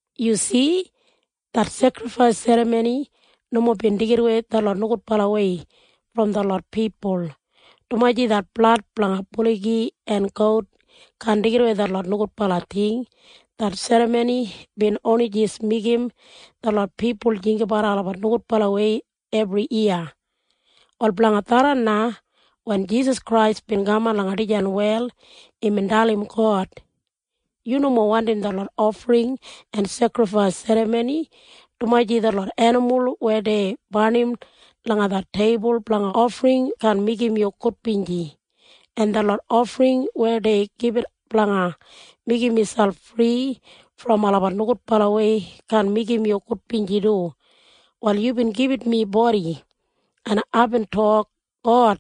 Yu si? Det sekrifais serramoni nomo bin deigidawei detlot nogudbalawei brom detlot pipul, dumaji det blad blanga buligi en gout kaan deigidawei detlot nogudbala ting. Det serramoni bin oni jis meigim detlot pipul jinggabat olabat nogudbalawei ebriyiya. Wal blanga tharran na, wen Jisas Krais bin kaman langa dijan wel, imbin dalim God, “Yu nomo wandim detlot ofring en sekrifais serramoni, dumaji detlot enimul weya dei barnim langa det teibul blanga ofring kaan meigim yu gudbinji, en detlot ofring weya dei gibit blanga meigim miselp fri brom olabat nogudbalawei kaan meigim yu gudbinji du. Wal yubin gibit mi bodi, en aibin tok, ‘God,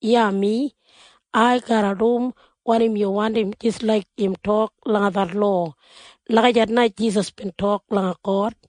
iya mi. Ai garra dum wanim yu wandim jis laik im tok langa det lowa.’” Lagijat na Jisas bin tok langa God.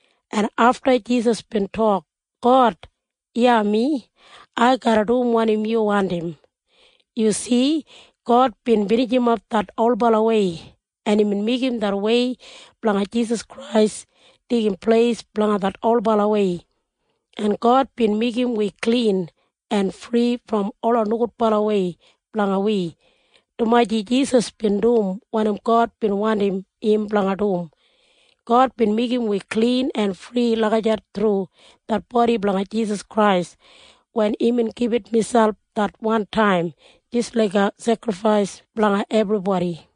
En afta Jisas bin tok, “God, iya mi. Ai garra dum wanim yu wandim.” Yu si? God bin binijimap det olbalawei, en imbin meigim det wei blanga Jisas Krais deigim pleis blanga det olbalawei, en God bin meigim wi klin en fri brom ola nogudbalawei blanga wi, dumaji Jisas bin dum wanim God bin wandim im blanga dum. God bin meigim wi klin en fri lagijat thru det bodi blanga Jisas Krais wen imbin gibit miselp det wantaim jis laiga sekrifais blanga ebribodi.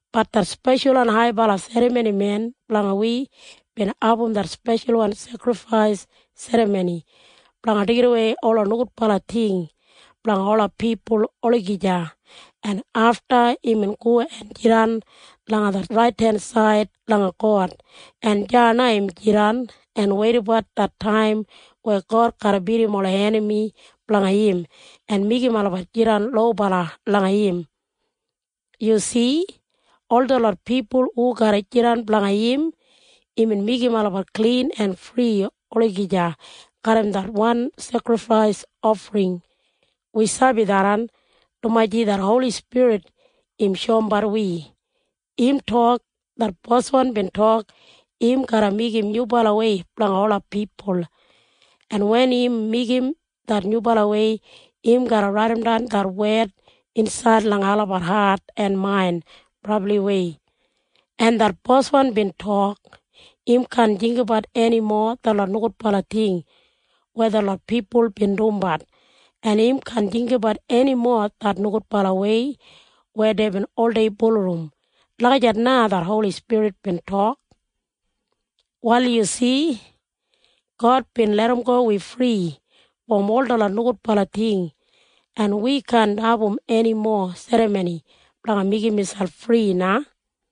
Bat det speshalwan haibala serramonimen blanga wi bin abum det speshalwan sekrifais serramoni blanga deigidawei ola nogudbala ting blanga ola pipul olagija, en afta imbin go en jidan langa det raidensaid langa God, en deya na im jidan en weidabat det taim weya God garra bidim ola enami blanga im en meigim olabat jidan lobala langa im. Yu si? Ol detlot pipul hu garra jidan blanga im, imbin meigim olabat klin en fri olagija garram det wan sekrifais ofring. Wi sabi tharran, dumaji det Holi Spirit im shoumbat wi. Im tok, “Det Boswan bin tok im garra meigim nyubalawei blanga ola pipul, en wen im meigim det nyubalawei, im garra raidimdan det wed insaid langa olabat hat en main brabliwei. En det Boswan bin tok im kaan jinggabat enimo detlot nogudbala ting weya detlot pipul bin dumbat, en im kaan jinggabat enimo det nogudbalawei weya deibin oldei bulurrum.” Lagijat na det Holi Spirit bin tok. Wal yu si? God bin larramgo wi fri brom ol detlot nogudbala ting, en wi kaan abum enimo serramoni blanga meigim miselp fri na.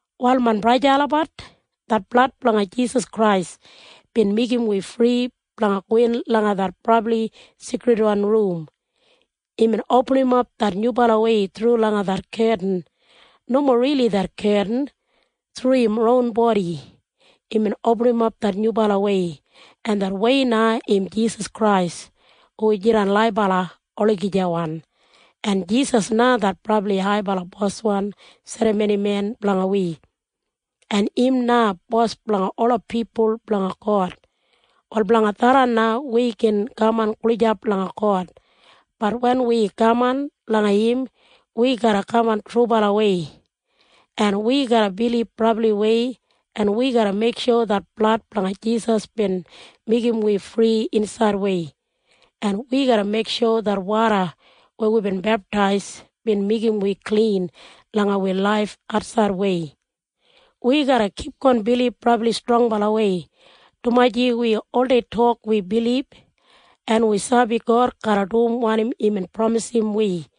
Wal main braja en sista olabat, det blad blanga Jisas Krais bin meigim wi fri blanga gowin langa det Brabli Seikridwan Rum. Imbin opinimap det nyubalawei thru langa det ketin. Nomo rili det ketin. Thru im ron bodi imbin opinimap det nyubalawei, en det wei na im Jisas Krais hu jidan laibala olagijawan, en Jisas na det brabli haibala Boswan serramonimen blanga wi, en im na Bos blanga ola pipul blanga God. Wal blanga tharran na wi gin kaman gulijap langa God. Bat wen wi kaman langa im, wi garra kaman trubalawei, en wi garra bilib brabliwei, en wi garra meiksho det blad blanga Jisas bin meigim wi fri insaidwei, en wi garra meiksho det woda weya wibin beptais bin meigim wi klin langa wi laif atsaidwei. Wi garra kipgon bilib brabli strongbalawei, dumaji wi oldei tok wi bilib, en wi sabi God garra dum wanim imbin pramisim wi.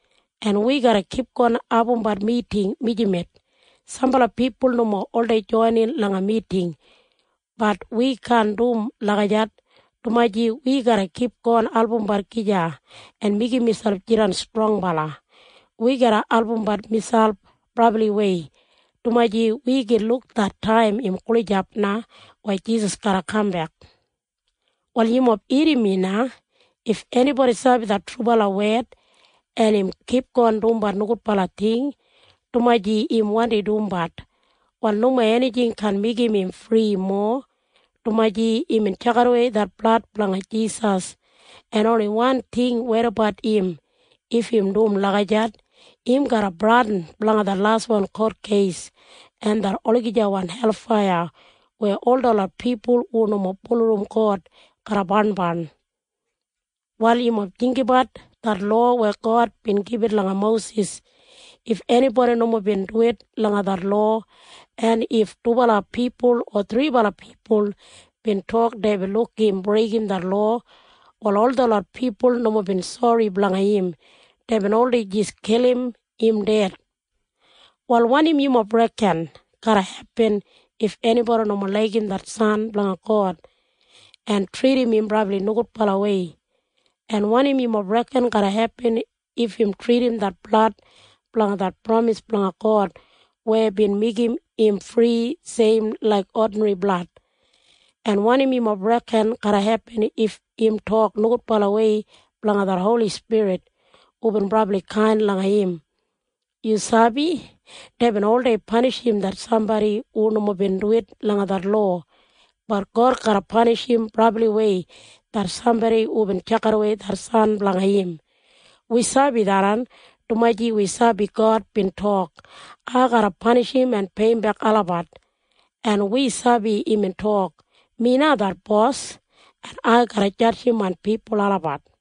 en wi garra kipgon abumbat miting mijamet. Sambala pipul nomo oldei joinin langa miting. Bat wi kaan dum lagijat, dumaji wi garra kipgon albumbat gija en meigim miselp jidan strongbala. Wi garra albumbat miselp brabliwei, dumaji wi gin luk det taim im gulijap na weya Jisas garra kambek. Wal yumob irrim mi na. If enibodi sabi det trubala wed, en im kipgon dumbat nogudbala ting dumaji im wandi dumbat, wal nomo enijing kaan meigim im fri mowa, dumaji imbin tjakidawei det blad blanga Jisas, en oni wan ting weidabat im if im dum lagijat. Im garra bradin blanga det laswan kotkeis en det olagijawan helfaiya weya ol detlot pipul hu nomo bulurrum God garra barnbarn. Wal yumob jinggabat det lowa weya God bin gibit langa Mosis. If enibodi nomo bin duwit langa det lowa, en if dubala pipul o thribala pipul bin tok deibin luk im breigim det lowa, wal ol detlot pipul nomo bin sori blanga im. Deibin oldei jis kilim im ded. Wal wanim yumob reken garra hepin if enibodi nomo laigim det San blanga God en tridim im brabli nogudbalawei? En wanim yumob reken garra hepin if im tridim det blad blanga det pramis blanga God weya bin meigim im fri seim laik odinri blad? En wanim yumob reken garra hepin if im tok nogudbalawei blanga det Holi Spirit hubin brabli kain langa im? Yu sabi? Deibin oldei panishim det sambodi hu nomo bin duwit langa det lowa. Bat God garra panishim brabliwei det sambodi hubin tjakidawei det San blanga im. Wi sabi tharran, dumaji wi sabi God bin tok, “Ai garra panishim en peiyimbek olabat.” En wi sabi imbin tok, “Mi na det Bos, en ai garra jadjim main pipul olabat.”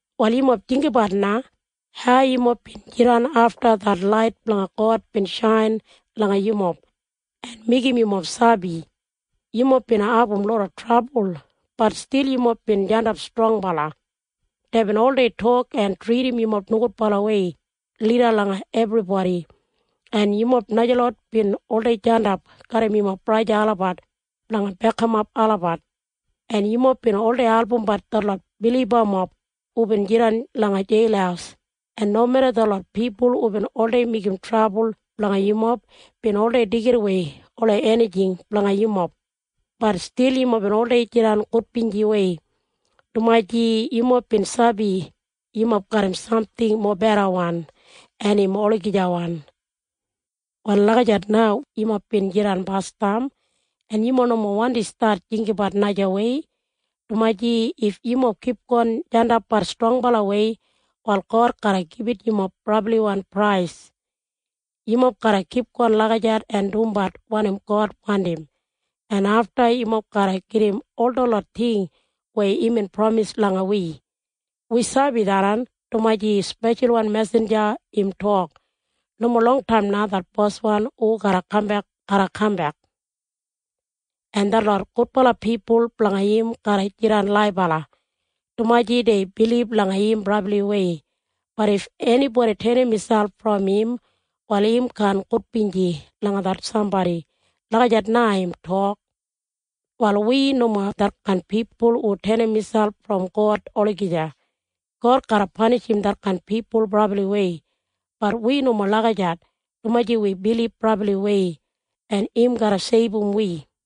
Wal yumob jinggabat na hau yumob bin jidan afta det lait blanga God bin shain langa yumob en meigim yumob sabi. Yumob bin abum loda trabul. Bat stil yumob bin jandap strongbala. Deibin oldei tok en tridim yumob nogudbalawei lida langa ebribodi, en yumob najalot bin oldei jandap garram yumob braja olabat blanga bekimap olabat, en yumob bin oldei albumbat detlot bilibamob hubin jidan langa jeil, en nomeda detlot pipul hubin oldei meigim trabul blanga yumob bin oldei deigidawei ola enijing blanga yumob, bat stil yumob bin oldei jidan gudbinjiwei, dumaji yumob bin sabi yumob garram samting mobedawan en im olagijawan. Wal lagijat na yumob bin jidan basdam, en yumob nomo wandi stat jinggabat najawei, dumaji if yumob kipgon jandapbat strongbalawei, wal God garra gibit yumob brabliwan prais. Yumob garra kipgon lagijat en dumbat wanim God wandim, en afta yumob garra gedim ol detlot ting weya imbin pramis langa wi. Wi sabi tharran, dumaji speshalwan mesinja im tok, “Nomo longtaim na det Boswan hu garra kambek garra kaman dregli, en detlot gudbala pipul blanga im garra jidan laibala, dumaji dei bilib langa im brabliwei. Bat if enibodi tenim miselp brom im, wal im kaan gudbinji langa det sambodi.” Lagijat na im tok. Wal wi nomo detkain pipul hu tenim miselp brom God olagija. God garra panishim detkain pipul brabliwei. Bat wi nomo lagijat, dumaji wi bilib brabliwei, en im garra seibum wi.